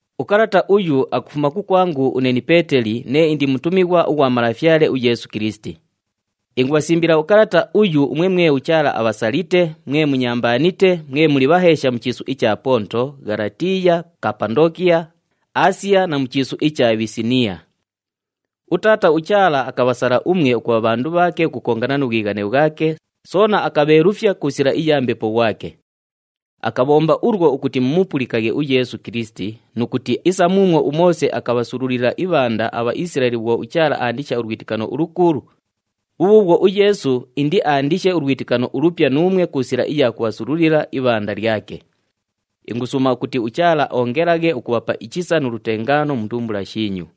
Ukalata uyu akufuma kukwangu une ni Peeteli nee indi mutumighwa ughwa Malafyale uYeesu Kilisiti. Ingubhasimbila ukalata uyu umwe mwe uChaala abhasalite, mwe munyambaanite, mwe muli bhaheesha mu chiisu icha Ponto, Ghalatiiya, Kapandookiya, Aasiya na mu chiisu icha Bhisiniiya. UTaata uChaala akabhasala umwe ukubha bhandu bhaake ukukongana nu bhwighane bhwake, soona akabheelufya ku sila iya Mbepo ghwake. Akabhomba ulwo ukuti mumupulikaghe uYeesu Kilisiti nu kuti isa muumwo uMoose akabhasululila ibhanda aBhaisilaeli bhwo uChaala aandisha ulwitikano ulukuulu, bhubhuubhwo uYeesu indiaandishe ulwitikano ulupya nuumwe ku sila iya kubhasululila ibhanda lyake. Ingusuuma ukuti uChaala oongelaghe ukubhapa ichisa nu lutengaano mu ndumbula shiinyu.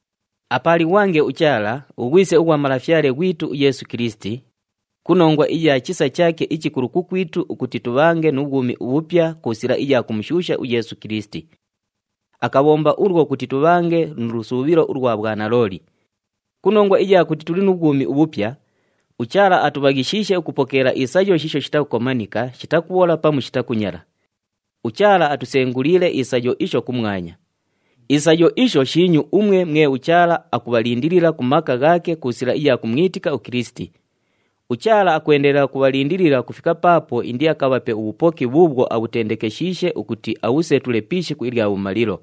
Apaalighwange uChaala, uGhwise ughwa Malafyale ghwitu uYeesu Kilisiti, ku nongwa iya chisa chaake ichikulu kukwitu ukuti tubhange nu bhwumi ubhupya ku sila iya kumushuusha uYeesu Kilisiti. Akabhomba ulwo ukuti tubhange nu lusuubhilo ulwa bhwanalooli. Ku nongwa iya kuti tuli nu bhwumi ubhupya, uChaala atubhaghishiishe ukupokeela isayo shiisho shitakukomanika, shitakubhola pamu shitakunyala. UChaala atusenguliile isayo isho kumwanya. Isayo isho shiinyu umwe mwe uChaala akubhalindilila ku maka ghaake ku sila iya kumwitika uKilisiti. UChaala akwendelela ukubhalindilila ukufika paapo indiakabhape ubhupoki bhuubhwo abhutendekeshiishe ukuti abhusetule pi ishiku ilya bhumalilo.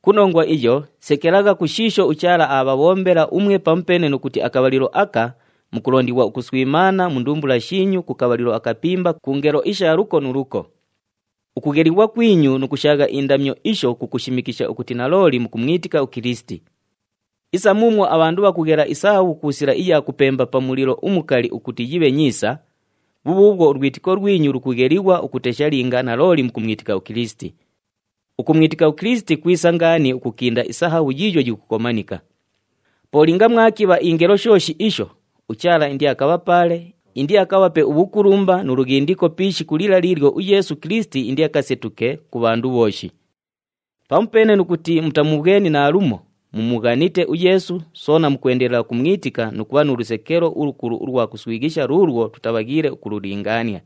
Ku nongwa iyo, sekelagha ku shiisho uChaala aabhabhombela umwe pamupeene nu kuti akabhalilo aka, mukulondighwa ukuswimaana mu ndumbula shiinyu ku kabhalilo akapimba ku ngelo isha luko nu luko. Ukughelighwa kwinyu nu kushaagha indamyo isho kukushimikisha ukuti nalooli mukumwitika uKilisiti. Isa muumwo abhandu bhakughela isahabhu ku sila iya kupemba pa mulilo umukali ukuti yibhe nyiisa, bhubhuubhwo ulwitiko lwinyu lukughelighwa ukutesha linga nalooli mukumwitika uKilisiti. Ukumwitika uKilisiti kwisa ngaani ukukinda isahabhu yiiyo yikukomanika. Po linga mwakibha ingelo shooshi isho, uChaala indiakabhapaale, indiakabhape ubhukulumba nu lughindiko pi ishiku lila liilyo uYeesu Kilisiti indiakasetuke ku bhandu bhooshi. Pamupeene nu kuti mutamubhweni naalumo, mumughanite uYeesu, soona mukwendelela ukumwitika nu kubha nu lusekelo ulukulu ulwa kuswighisha luulwo tutabhaghiile ukululingaania.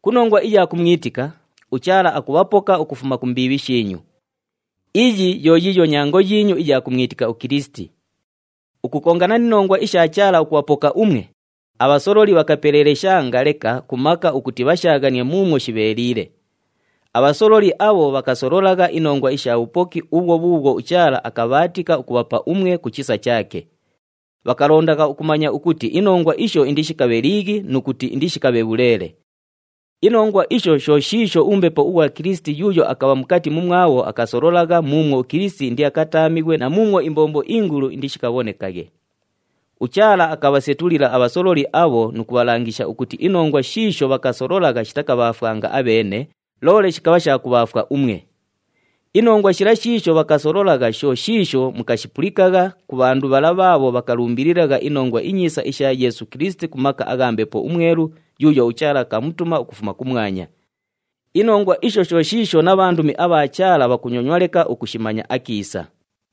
Ku nongwa iya kumwitika, uChaala akubhapoka ukufuma ku mbiibhi shiinyu. Iyo yo yiiyo nyango yiinyu iya kumwitika uKilisiti. Ukukongana ni nongwa isha Chaala ukubhapoka umwe, abhasololi bhakapeleeleshanga leka ku maka ukuti bhashaaghanie muumwo shibheeliile. Abhasololi abho bhakasololagha inongwa isha bhupoki ubhwo bhuubhwo uChaala akabhaatika ukubhapa umwe ku chisa chaake. Bhakalondagha ukumanya ukuti inongwa isho indishikabhe liighi nu kuti indishikabhe bhuleele. Inongwa isho sho shiisho uMbepo ughwa Kilisiti yuuyo akabha mukati mumwabho akasololagha muumwo uKilisiti indiakataamighwe na muumwo imbombo ingulu indishikabhonekaghe. UChaala akabhasetulila abhasololi abho nu kubhalangisha ukuti inongwa shiisho bhakasololagha shitakabhaafwanga abheene, loole shikabha sha kubhaafwa umwe. Inongwa shila shiisho bhakasololagha, sho shiisho mukashipulikagha ku bhandu bhala bhaabho bhakalumbililagha iNongwa iNyiisa isha Yeesu Kilisiti ku maka agha Mbepo uMwelu yuuyo uChaala akamutuma ukufuma kumwanya. Inongwa isho sho shiisho na bhandumi abha Chaala bhakunyonywa leka ukushimanya akiisa.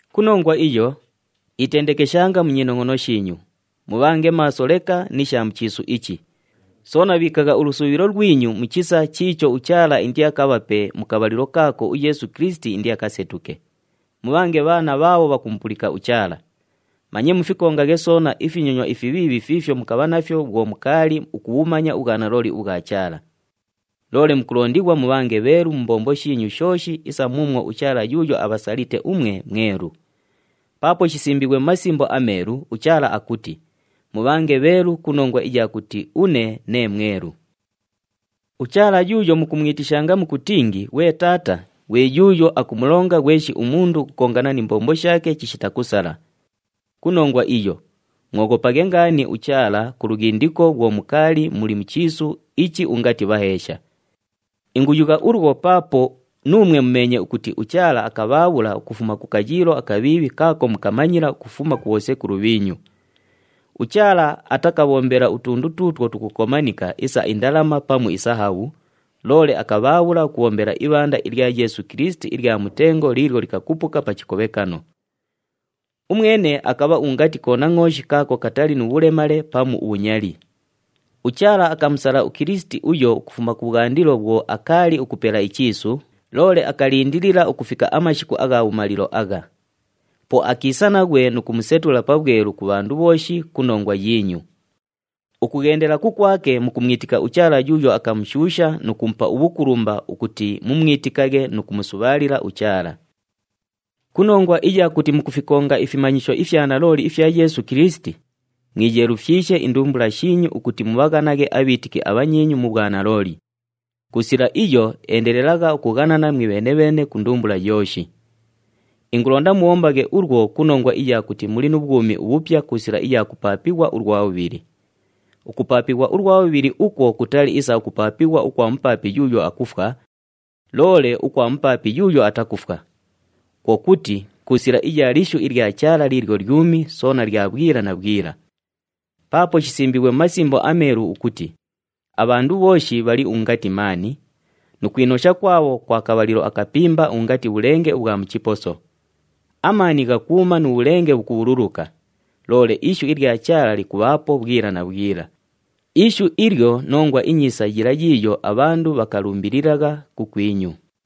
Ku nongwa iyo, itendekeshanga mu nyinongʼono shiinyu, mubhange maaso leka ni sha mu chiisu ichi, soona bhiikagha ulusuubhilo lwinyu mu chisa chiicho uChaala indiakabhape mu kabhalilo kaako uYeesu Kilisiti indiakasetuke. Mubhange bhaana bhaabho bhakumupulika uChaala. Manye mufikongaghe soona ifinyonywa ifibhiibhi fiifyo mukabha nafyo bhwo mukaali ukubhumanya ubhwanalooli ubhwa Chaala. Loole mukulondighwa mubhange bheelu mu mbombo shiinyu shooshi isa muumwo uChaala yuuyo abhasalite umwe mwelu. Paapo shisimbiighwe mu Masimbo aMeelu, uChaala akuti, “Mubhange bheelu ku nongwa iya kuti une nee mwelu.” UChaala yuuyo mukumwitishanga mukutingi, “Ghwe Taata,” ghwe yuuyo akumulonga ghweshi umundu ukukongana ni mbombo shaake chishita kusala. Ku nongwa iyo, mwoghopaghe ngaani uChaala ku lughindiko bhwo mukaali muli mu chiisu ichi ungati bhaheesha. Inguyugha ulwo paapo nuumwe mumeenye ukuti uChaala akabhaabhula ukufuma ku kayiilo akabhiibhi kaako mukamanyila ukufuma ku bhosekulu bhiinyu. UChaala atakabhombela utundu tuutwo tukukomanika isa indalama pamu isahabhu, loole akabhaabhula ukubhombela ibhanda ilya Yeesu Kilisiti ilya mutengo liilyo likakupuka pa chikobhekano. Umwene akabha ungati konangʼooshi kaako katali nu bhulemale pamu ubhunyali. UChaala akamusala uKilisiti uyo ukufuma kubhwandilo bhwo akaali ukupela ichiisu, loole akalindilila ukufika amashiku agha bhumalilo agha. Po akiisa naghwe nu kumusetula pabhwelu ku bhandu bhooshi ku nongwa yiinyu. Ukughendela kukwake mukumwitika uChaala yuuyo akamushuusha nu kumupa ubhukulumba ukuti mumwitikaghe nu kumusubhaalila uChaala. Ku nongwa iya kuti mukufikonga ifimanyisho ifya nalooli ifya Yeesu Kilisiti, mwiyeelufyishe indumbula shiinyu ukuti mubhaghanaghe abhiitiki abhanyiinyu mu bhwanalooli. Ku sila iyo, endelelagha ukughanana mwibheene-bheene ku ndumbula yooshi. Ingulonda mubhombaghe ulwo ku nongwa iya kuti muli nu bhwumi ubhupya ku sila iya kupaapighwa ulwa bhubhili. Ukupaapighwa ulwa bhubhili ukwo kutali isa ukupaapighwa ukwa mupaapi yuuyo akufwa, loole ukwa mupaapi yuuyo atakufwa. Kwo kuti, ku sila iya lishu ilya Chaala liilyo lyumi, soona lya bhwila na bhwila. Paapo shisimbiighwe mu Masimbo aMeelu ukuti, “Abhandu bhooshi bhali ungati maani, nu kwinosha kwabho kwa kabhalilo akapimba ungati bhulenge ubhwa mu chiposo. Amaani ghakuuma nu bhulenge bhukubhululuka, loole ishu ilya Chaala likubhaapo bhwila na bhwila.” Ishu ilyo Nongwa iNyiisa yila yiiyo abhandu bhakalumbililagha kukwinyu.